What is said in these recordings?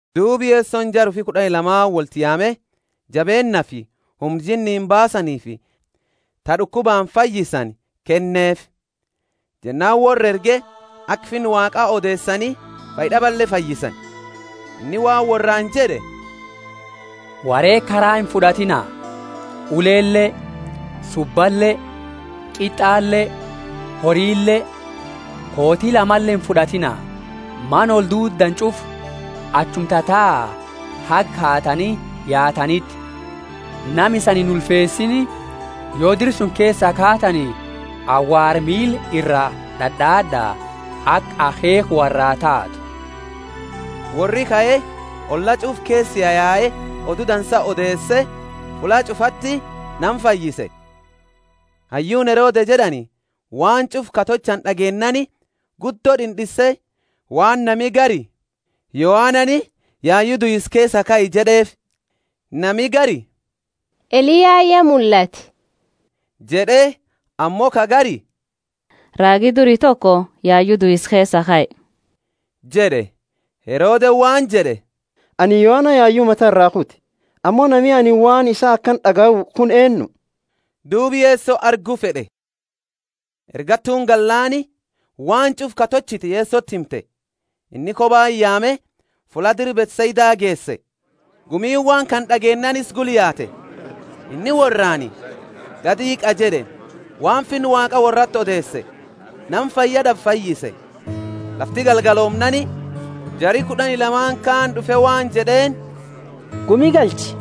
Duuba Yesoni jara ufi kud'ani lamaani kaani wolti yaame, jabeennaafi humna jinniini baasaniifi ta d'ukubaani fayyisani kenneefi. Jennaani worra erge aka Finna Waaqa odeesani fayyad'abale fayyisani. Inni waan worraani jed'e, Woreega karaa imfud'atiina, ulele, subbale, qit'ale, horile, kooti lamale imfud'atiina. Mana olduuddani ch'ufa achuma tataa haga kaatani yaataniti. Nama isani inulfeesiini, yo dira suni keesaa kaatani, awaara miila iraa d'ad'aad'a, aka akheekha worraa taatu. Worri kae olla ch'ufa keesa yayae Odu Dansa odeese, fulla ch'ufati nama fayyise. Hayyuuni Herode jed'ani waan ch'ufa ka tolchani d'ageennaani guddo d'ind'inse waan nami gari, Yohanani yayu duisa keesaa kae jed'eefi. Nami gari, Eliyaani ya mullate jed'e, ammo ka gari, Raagi duri toko yayu duisa keesaa kae jed'e. Herodeni waan jed'e, Anini Yohana yayu mata iraa kute, ammo nami anini waan isaa akana d'agayu kuni eennu? Duuba Yeso argu fed'e. Ergattuuni gallaani waan ch'ufa ka tolchite Yesoti himte. Inni kobati yaame fulla dira Bethsaida geese. Gumiini waan kana d'ageennaani isa gula yaate. Inni worraani, Gadi hiiqa jed'e, waan Finna Waaqa worrati odeese, nama fayya d'abe fayyise. Lafti galgaloomnaani jari kud'ani lamaani kaani d'ufe waan jed'eeni, Gumi galchi,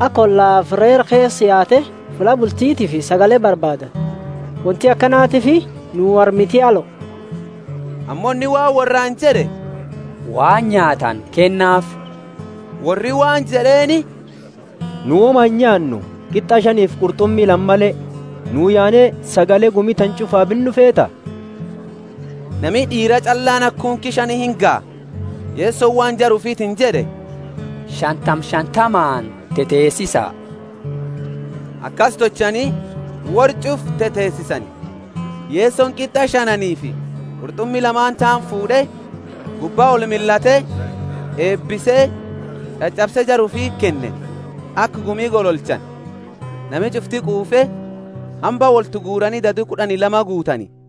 aka ollafi reera keesa yaate fulla bultitiifi sagale barbaadatu; wonti akanatiifi nuu armiti alo. Ammo inni waan worraani jed'e, Waan nyaatani kennaafi. Worri waan jed'eeni, Nu woma inyaannu, qit'a shanifi qurt'umi lama male. Nuu yaane sagale gumi tana ch'ufa binnu feeta? (Nami d'iira ch'allaani haga kunki shani ingaha.) Yesoni waan jara ufitiini jed'e, Shantama shantamaani teteesisa. Akasi tolchani, worra ch'ufa teteesisani. Yesoni qit'a shanaaniifi qurt'umi lamaani taani fuud'e, gubba olmillate eebise ch'ach'abse jara ufiti kenne, aka gumi gololchani. Nami ch'ufti quufe, hamba wolti guurani dadu kud'ani lama guutani.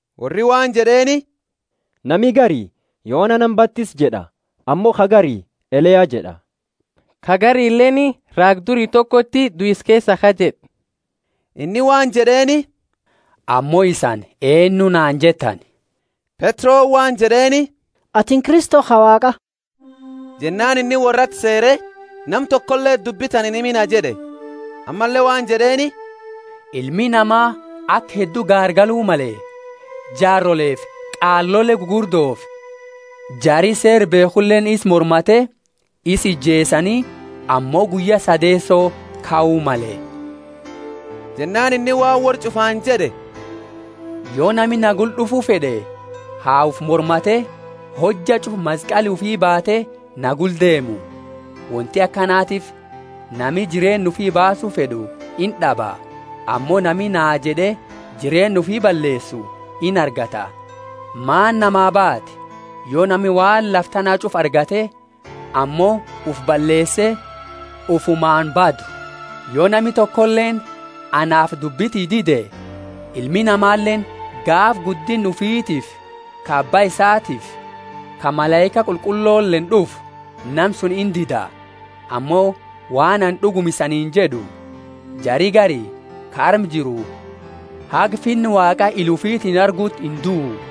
Worri waan jed'eeni, Nami gari Yohana nama batisu jed'a; ammo ka gari Eliya jed'a; ka garileeni, Raaga duri tokoti duisa keesaa kae jed'a. Inni waan jed'eeni, Ammo isani eennu naani jettani? Petroni waan jed'eeni, Atini Kristo ka Waaqa. Jennaani inni worrati seere, Nama tokoleti dubbi tana inhimina jed'e. Ammalle waan jed'eeni, Ilmi Nama aka heddu gaargalu male, jaaroleefi qaalole gugurdofi jari Seera beekhuleeni isa mormate, isa ijeesani, ammo guyya sadeeso kau male. Jennaani inni waan worra ch'ufaani jed'e, Yo nami na gula d'ufu fed'e ha ufi mormate hojja ch'ufa maskali ufi baate na gula deemu. Wonti akanatiifi nami jireenna ufi baasu fed'u ind'aba; ammo nami naa jed'e jireenna ufi balleesu inargata. Maani namaa baati, yo nami waan lafa tana ch'ufa argate ammo ufi balleese ufumaani badu? Yo nami tokoleeni anaafi dubbi tiyya dide, Ilmi Namaleeni, gaafa guddinna ufitiifi ka Abba isatiifi ka malaika qulqulloleeni d'ufu, nama suni indida. Ammo waan anini d'uguma isaniini jed'u, Jari gari ka arma jiru haga Finna Waaqa ila ufitiini arguti induu.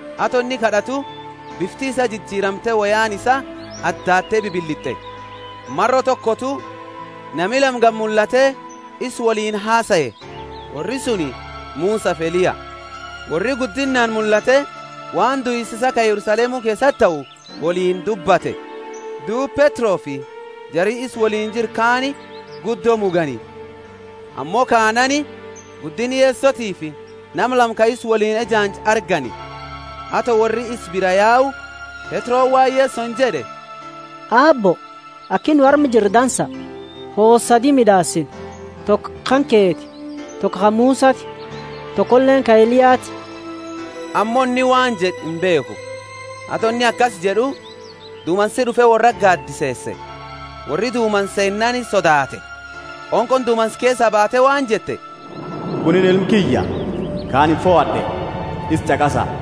Ato inni kad'atu, bifti isaa jijiramte woyaani isaa addaatte bibilit'e. Maro tokotu nami lama gadi mullate isa woliini hasae; worri suni Musafi Eliya. Worri guddinnaani mullate waan duisa isaa ka Yerusalemu keesati tahu, woliini dubbate. Duuba Petrofi jari isa woliini jiru kaani guddo mugani, ammo kaanaani guddinna Yesotiifi nama lama ka isa woliini ejaanju argani. Ato worri isa biraa yau, Petroni waan Yesoni jed'e, Aabbo, aki nu arma jirru dansa. Hoosa sadi mid'aasina; toko kanketi, toko ka Musati, tokoleeni ka Eliyati. Ammo inni waan jed'e, imbeekhu. Ato inni akasi jed'u dumansi d'ufe worrati gaadiseese, worri dumansa seennaani sodaate. Qonqooni dumansa keesaa baate waan jette, Kunini Ilma kiyya, ka anini fohad'e; isa ch'aqasa.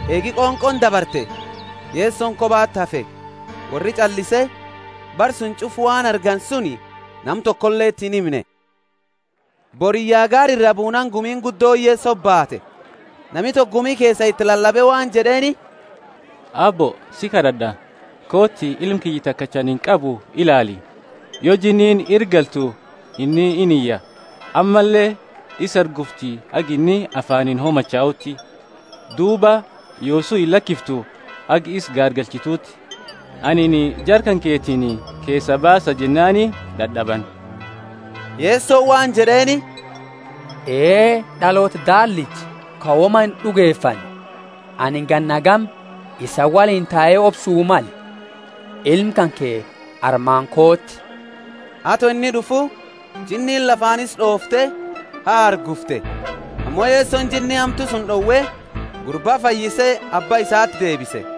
Eegi qonqooni dabarte Yesoni kobati hafe. Worri ch'allise, bara suni ch'ufa waan argani suni nama tokoleti inhimne. Boriyya gaara iraa buunaani gumiini guddooni Yesoti baate. Nami toko gumi keesa iti lalabe waan jed'eeni, Aabbo si kad'ad'a kooti ilma kiyya takacha anini qabu ilaali. Yo jinniini ira galtu inni iniya; ammalle isa hargufti haga inni afaaniini homachauti, duuba yoosu illakiftu haga isa gaargalchituti. Anini jara kanketiini, keesaa baasa jennaani dad'abani. Yesoni waan jed'eeni, Ee, d'aloota daallicha ka woma ind'ugefanne, anini ganna hagami isani woliini tae obsu male? Ilma kanke armaani kooti. Ato inni d'ufu, jinniini lafaani isa d'oofte hahargufte. Ammo Yesoni jinni hamtu suni d'owe, gurba fayyise abba isati deebise.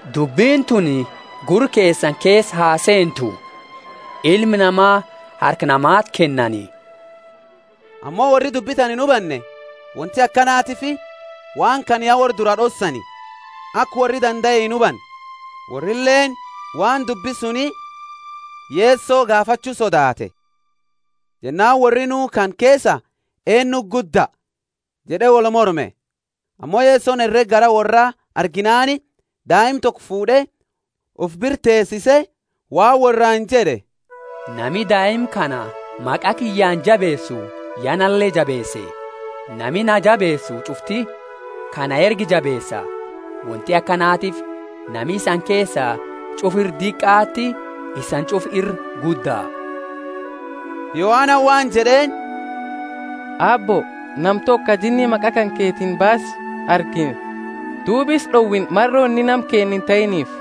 Dubbini tuni gurra keesani keesa ha seentu! Ilma Nama harka namati kennani. Ammo worri dubbi tana inhubanne wonti akanatiifi waan kana ya worra dura d'ossaani, aka worri dandae inhubanne, worrileeni waan dubbi suni Yeso gaafachu sodaate. Jennaani worri nuu kana keesa eennuti gudda? jed'e wolmorme. Ammo Yesoni herega garaa worraa arginaani daima toko fuud'e ufi bira teesise, waan worraani jed'e, Nami daima kana maqa kiyyaani jabeesu ya nale jabeese; nami naa jabeesu ch'ufti ka na erge jabeesa. Wonti akanatiifi nama isani keesa ch'ufa ira diqaati isani ch'ufa ira gudda. Yohanani waan jed'eeni, Aabbo, nama toko ka jinni maqa kanketiini baasu argine, duuba isa d'owine maro inni nama keenna intahiiniifi.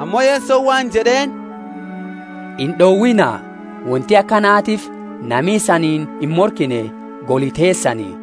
Ammo Yesoni waan jed'eeni, Ind'owiina, wonti akanatiifi nami isaniini imorkine goli teesani.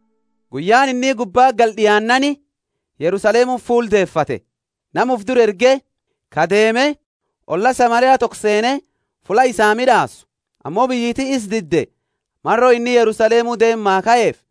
Guyyaani inni gubbati galu d'iananaani Yerusalemuti fuula deefate. Nama ufi dura erge, ka deeme olla Samaria toko seene fulla isaa mid'aasu. Ammo biyyiti isa dide maro inni Yerusalemu deema kaefi.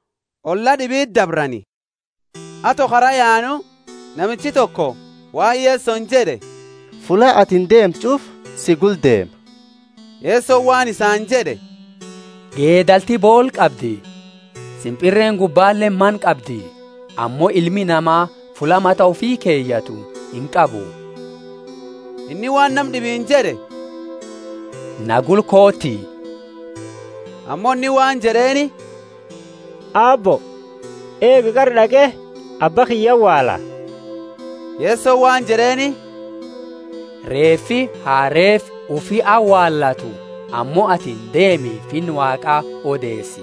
olla d'ibiti dabrani. Ato kara yaanu, namichi toko waan Yesoni jed'e, Fulla atini deemtu ch'ufa si gula deema. Yesoni waan isaani jed'e, Geedalti boola qabdi, simpirreeni gubbaleeni mana qabdi, ammo Ilmi Nama fulla mata ufi keyatu inqabu. Inni waan nama d'ibiini jed'e, Na gula kooti. Ammo inni waan jed'eeni, Aabbo, eegi, qara d'aqe abba kiyya awaala. Yesoni waan jed'eeni, Reefi ha reefa ufi awaalatu; ammo atini deemi Finna Waaqa odeesi.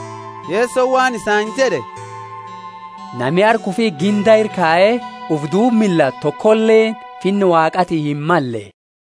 Yesoni waan isaani jed'e, Nami harka ufi ginda ira kaye ufi duuba millatu tokoleeni Finna Waaqaati himmalle.